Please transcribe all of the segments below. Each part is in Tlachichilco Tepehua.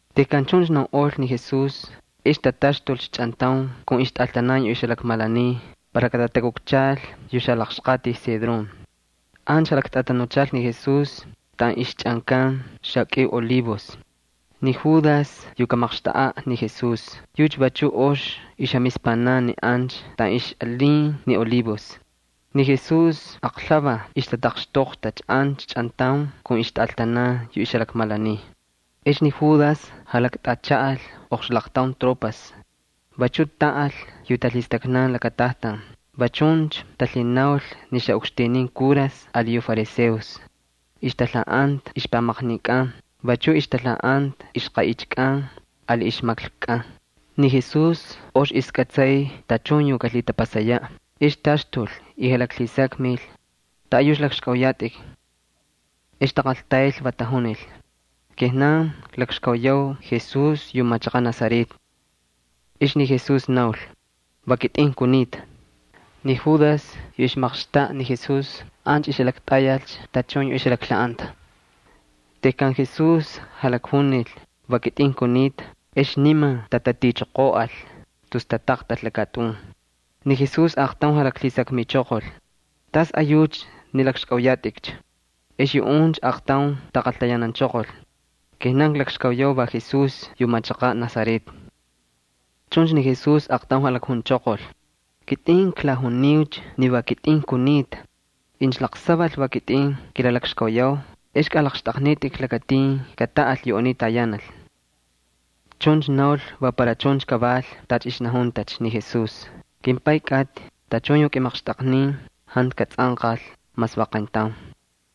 Tejkan chuncha naunꞌol ni Jesús ex tataxtulcha chꞌantaun kun ixtꞌaltanan yu jalakmalaniy para katatakukchalcha yu xalaqxqatij Cedrón. Ancha jalaktꞌatanuchalcha ni Jesús taꞌan ixchꞌankan xakꞌiu olivos. Ni Judas yu kamaqxtaꞌaꞌ ni Jesús, yucha vachu ox ixjamispanan ni ancha taꞌan ixꞌalin ni olivos. Ni Jesús aqlhuvaj ixtataqxtoqtacha ancha chꞌantaun kun ixtꞌaltanan yu jalakmalaniy. Ex ni Judas jalaktꞌachaꞌal oqxlaqtaun tropas. Vachuꞌ taꞌal yu talhistaknan lakatajtan, va chuncha talhinaul ni xaꞌukxtinin kuras ali yu fariseos. Ixtalhaꞌanta ixpamaqninkꞌan vachuꞌ ixtalhaꞌanta ixqaꞌichikꞌan ali ixmaklkukꞌan. Ni Jesús ox ixkꞌatsay tachun yu kalhitapasayaꞌ, ex taxtul y jalaklhisakmil: —¿Taꞌayucha lakxkꞌauyatꞌikcha? Ex taqaltayl, va tajunil: —Kijnan klakxkauyau Jesús yu machaqaꞌ Nazaret. Ex ni Jesús naul: —Va kitꞌin kunita. Ni Judas yu ixmaqxtaꞌa ni Jesús ancha ixjalaktꞌayalcha tachun yu ixjalaklhaꞌanta. Tejkan Jesús jalakjunil: “Va kitꞌin kunita”, ex niman tatatichoqoꞌal tus tataqtal lakatꞌun. Ni Jesús aaqtaun jalaklhisakmichoqol: —¿Tasꞌayucha ni lakxkꞌauyatꞌikcha? Ex yuꞌuncha aaqtaun taqaltayananchoqol: —Kijnan klakxkauyau va Jesús yu machaqaꞌ Nazaret. Chuncha ni Jesús aaqtaun jalakjunchoqol: —Kitꞌin klajuniucha ni va kitꞌin kunita. Incha laqsaval va kitꞌin kilalakxkauyau ex kꞌalaqxtꞌaqnitꞌik lakatin kataꞌal yu aniy tayanal. Chuncha naul va para chuncha kaval tacha ixnajuntacha ni Jesús: “KimPay kꞌatꞌi, tachun yu kꞌimaqxtꞌaqnin jantu katsꞌanqal mas va qayntaun.”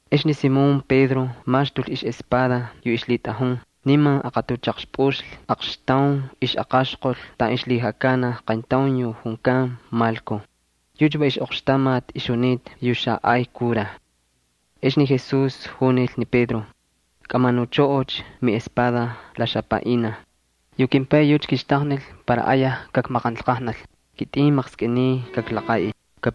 Ex ni Simón Pedro maxtul ixꞌespada yu ixlhitꞌajun, niman aqatuchaqxpꞌuxlhi aqxtaun ixꞌaqaxqol taꞌan la ixlhijakanaj qayntaun yu junkan Malko. Yucha va ixꞌoqxtamati ixjunita yu xaꞌay kuraj. Ex ni Jesús junil ni Pedro: —Kꞌamanuchꞌoꞌocha miꞌespada la xapaꞌinaj. Yu kimPay yucha kixtaqnil para ayaj kakmaqanlqajnal, kitꞌin maqskꞌiniy kaklaqaꞌil.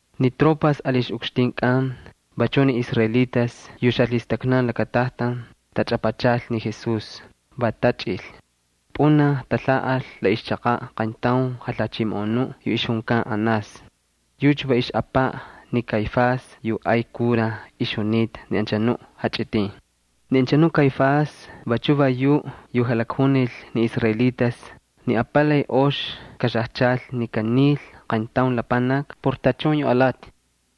Ni tropas ali ixꞌukxtinkꞌan, vachuꞌ ni israelitas yu xalhistaknan lakatajtan tachꞌapachal ni Jesús, va tachꞌil. Pꞌunaj talhaꞌal la ixchaqaꞌ qayntaun jalhachimoꞌonuꞌ yu junkan Anás. Yucha va ixꞌapaꞌ ni Caifás yu ay kuraj ixjunita ni anchanuꞌ jachꞌitin. Ni anchanuꞌ Caifás vachu va yuꞌ yu jalakjunil ni israelitas ni apalay ox kaxajchal incha kanil qayntaun lapanaki por tachun yu alati.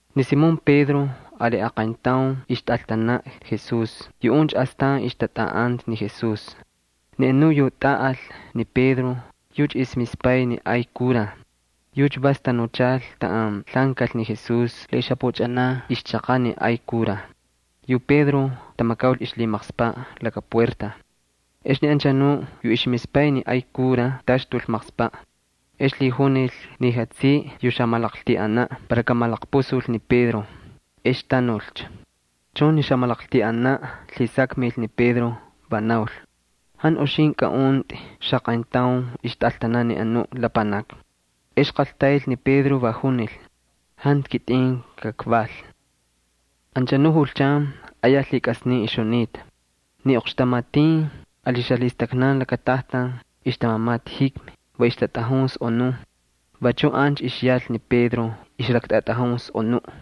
Ni Simón Pedro ali aqayntaun ixtꞌaltanaꞌ Jesús, yuꞌuncha astan ixtatꞌaꞌanta ni Jesús. Ni anuꞌ yu tꞌaꞌal ni Pedro yucha ixmispay ni ay kuraj. Yucha vas tanuchal taꞌan lhaꞌankal ni Jesús la ixjapuchꞌanan ixchaqaꞌ ni ay kuraj. Yu Pedro tamakaul ixlhimaqspaꞌ laka puerta, ex ni anchanuꞌ yu ixmispay ni ay kuraj taxtul maqspaꞌ. Ex lhijunil ni jatsiꞌi yu xamalaqltiꞌanaꞌ para kamalaqpusul ni Pedro, ex tanulcha. Chuncha ni xamalaqltiꞌanaꞌ lhisakmil ni Pedro, va naul: —¿Jantu uxintꞌi kaꞌuntꞌi xaqayntaun ixtꞌaltanaꞌ ni anu lapanaki? Ex qaltayl ni Pedro, va junil: —Jantu kitꞌin kakval. Anchanuꞌ julchan ayaj lhikꞌasnin ixjunita. Ni oqxtamatin ali xalhistaknan lakatajtan ixtamamata jikmi, va ixtatꞌajun sꞌonun. Vachuꞌ ancha ixyal ni Pedro, ixlaktꞌatꞌajun sꞌonuꞌ.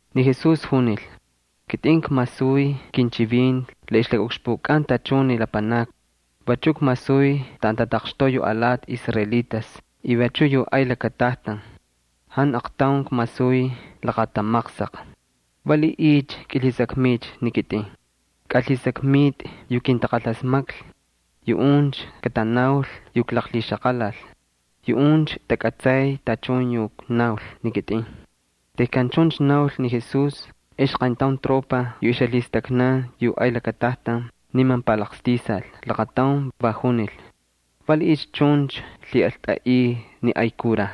Ni Jesús junil: —Kitꞌin kmasuy kinchivinti la ixlakaꞌukxpukꞌan tachun ni lapanakni. Vachuꞌ kmasuy taꞌan tataqxtoꞌa yu alati israelitas y vachuꞌ yu ay lakatajtan. Jantu aqtaun kmasuy laqatamaqsaq. ¿Valiꞌiycha kꞌilhisakmiycha ni kitꞌin? Kꞌalhisakmitꞌi yu kintaqalasmaklhi. Yuꞌuncha katanaul yu klaqlhixaqalal, yuꞌuncha takꞌatsay tachun yu knaul ni kitꞌin. Tejkan chuncha naul ni Jesús ex qayntaun tropa yu ixjalhistaknan yu ay lakatajtan niman palaqstisal laqataun, va junil: —¿Valiꞌiycha chuncha lhiꞌaltꞌaꞌiy ni ay kuraj?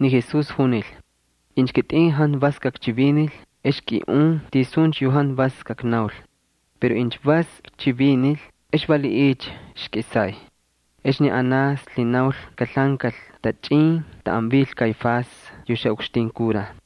Ni Jesús junil: —Incha kitꞌin jantu vas kakchivinil ex kꞌiꞌun tisuncha yu jantu vas kaknaul. Pero incha vas kchivinil, ¿ex valiꞌiycha ixkꞌisay? Ex ni Anás lhinaul kalhaꞌankal tachꞌin taꞌan vil ni Caifás yu xaꞌukxtin kuraj.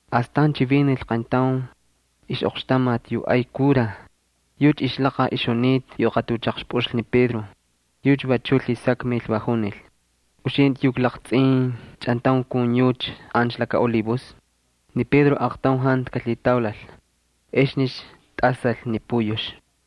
Astan chivinil qayntaun ixꞌoqxtamati yu ay kuraj. Yucha ixlaqaj ixjunita yu aqatuchaqxpꞌuxlhi ni Pedro. Yucha vachuꞌ lhisakmil, va junil: —¿Uxintꞌi klaqtsꞌin chꞌantaun kun yucha ancha laka olivos? Ni Pedro aaqtaun jantu kalhitaulal. Exnicha tꞌasal ni puyux.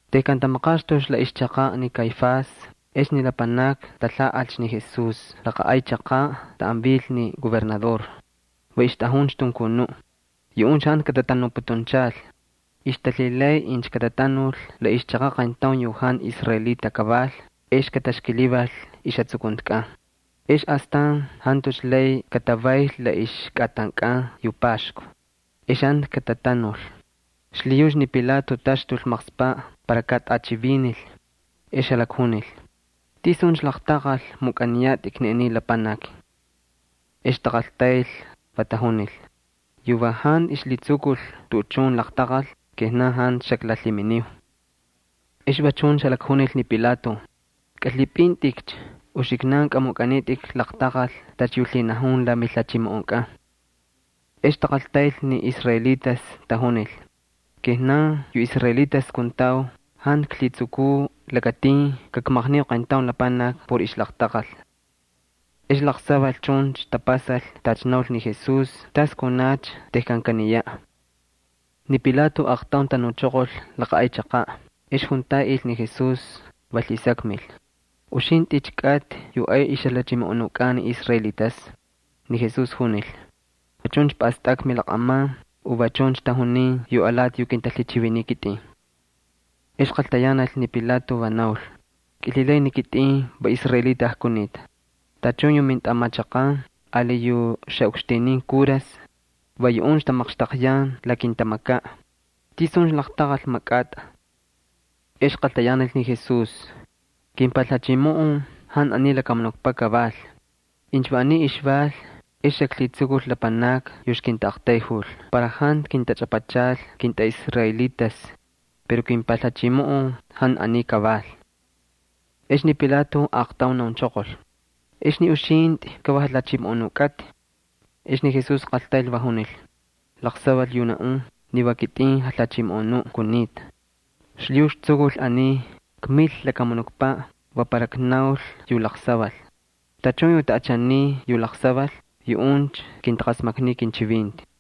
Tejkan tamaqaxtulcha la ixchaqaꞌ ni Caifás ex ni lapanakni talhaꞌalcha ni Jesús laqa ay chaqaꞌ taꞌan vil ni gobernador. Va ixtꞌajuncha tunkunuꞌ. Yuꞌuncha jantu katatanuputunchal. Ixtalhilay incha katatanul la ixchaqaꞌ qayntaun yu jantu israelita kaval ex kataxkilival ixjatsukuntikꞌan. Ex astan jantucha lay katavayl la ixkꞌatankꞌan yu Paxku, ex jantu katatanul. Xlhiyucha ni Pilato taxtul maqspaꞌ para katꞌachivinil, ex jalakjunil: —¿Tisuncha laqtaqal mukꞌaniyatꞌik ni aniy lapanaki? Ex taqaltayl, va tajunil: —Yu va jantu ixlhitsukul tuꞌuchun laqtaqal, kijnan jantu xaklalhiminiu. Ex va chuncha jalakjunil ni Pilato: —Kꞌalhipꞌintꞌikcha, uxiknan kꞌamukꞌanitꞌik laqtaqal tacha yu lhinajun la milhachimoꞌonkꞌan. Ex taqaltayl ni israelitas, tajunil: —Kijnan yu israelitas kuntau jantu klhitsukuu lakatin kakmaqniu qayntaun lapanaki por ixlaqtaqal. Ex laqsaval chuncha tapasal tacha naul ni Jesús tas kunacha tejkan kaniyaꞌ. Ni Pilato aaqtaun tanuchoqol laqa ay chaqaꞌ ex juntaꞌil ni Jesús, va lhisakmil: —¿Uxintꞌicha kꞌatꞌi yu ay ixjalhachimoꞌonukꞌan ni israelitas? Ni Jesús junil: —¿Va chuncha pꞌastꞌakꞌa milaqꞌaman u va chuncha tajuniy yu alati yu kintalhichiviniy kitꞌin? Ex qaltayanal ni Pilato, va naul: —¿Kilhilay ni kitꞌin va israelita kunita? Tachun yu mintꞌamachaqan ali yu xaꞌukxtinin kuras, va yuꞌuncha tamaqxtaqyan la kintamakaꞌ. ¿Tisuncha laqtaqal makꞌatꞌa? Ex qaltayanal ni Jesús: —Kimpalhachimoꞌon jantu aniy lakamunukpaꞌ kaval. Incha va aniy ixval ex xaklhitsukul lapanakni yu ixkintaꞌaqtayjul para jantu kintachꞌapachal kintꞌaꞌisraelitas. Pero kimpalhachimoꞌon jantu aniy kaval. Ex ni Pilato aaqtaun naunchoqol: —Ex ni uxintꞌi ka va jalhachimoꞌonu kꞌatꞌi. Ex ni Jesús qaltayl, va junil: —Laqsaval yu naꞌun, ni va kitꞌin jalhachimoꞌonuꞌ kunita. Xlhiyucha ktsukul aniy, kmil lakamunukpaꞌ va para knaul yu laqsaval. Tachun yu taꞌachaniy yu laqsaval yuꞌuncha kintaqasmakniy kinchivinti.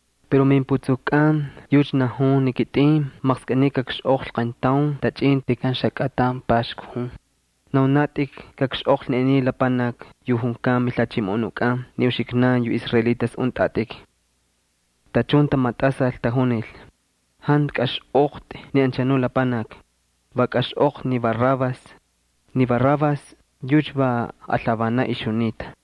Pero mimputsukukꞌan yucha najun ni kitꞌin maqskꞌiniy kakxꞌoqlhi qayntaun tachꞌin tejkan xakꞌatan Paxku jun. ¿Naunatꞌik kakxꞌoqlhi ni aniy lapanaki yu junkan mijalhachimoꞌonukꞌan ni uxiknan yu israelitas untꞌatꞌik? Tachun tamatꞌasal, tajunil: —¡Jantu kaxꞌoqtꞌi ni anchanu lapanaki! ¡Va kaxꞌoqtꞌi ni Barrabás! Ni Barrabás yucha va alhavanaꞌ ixjunita.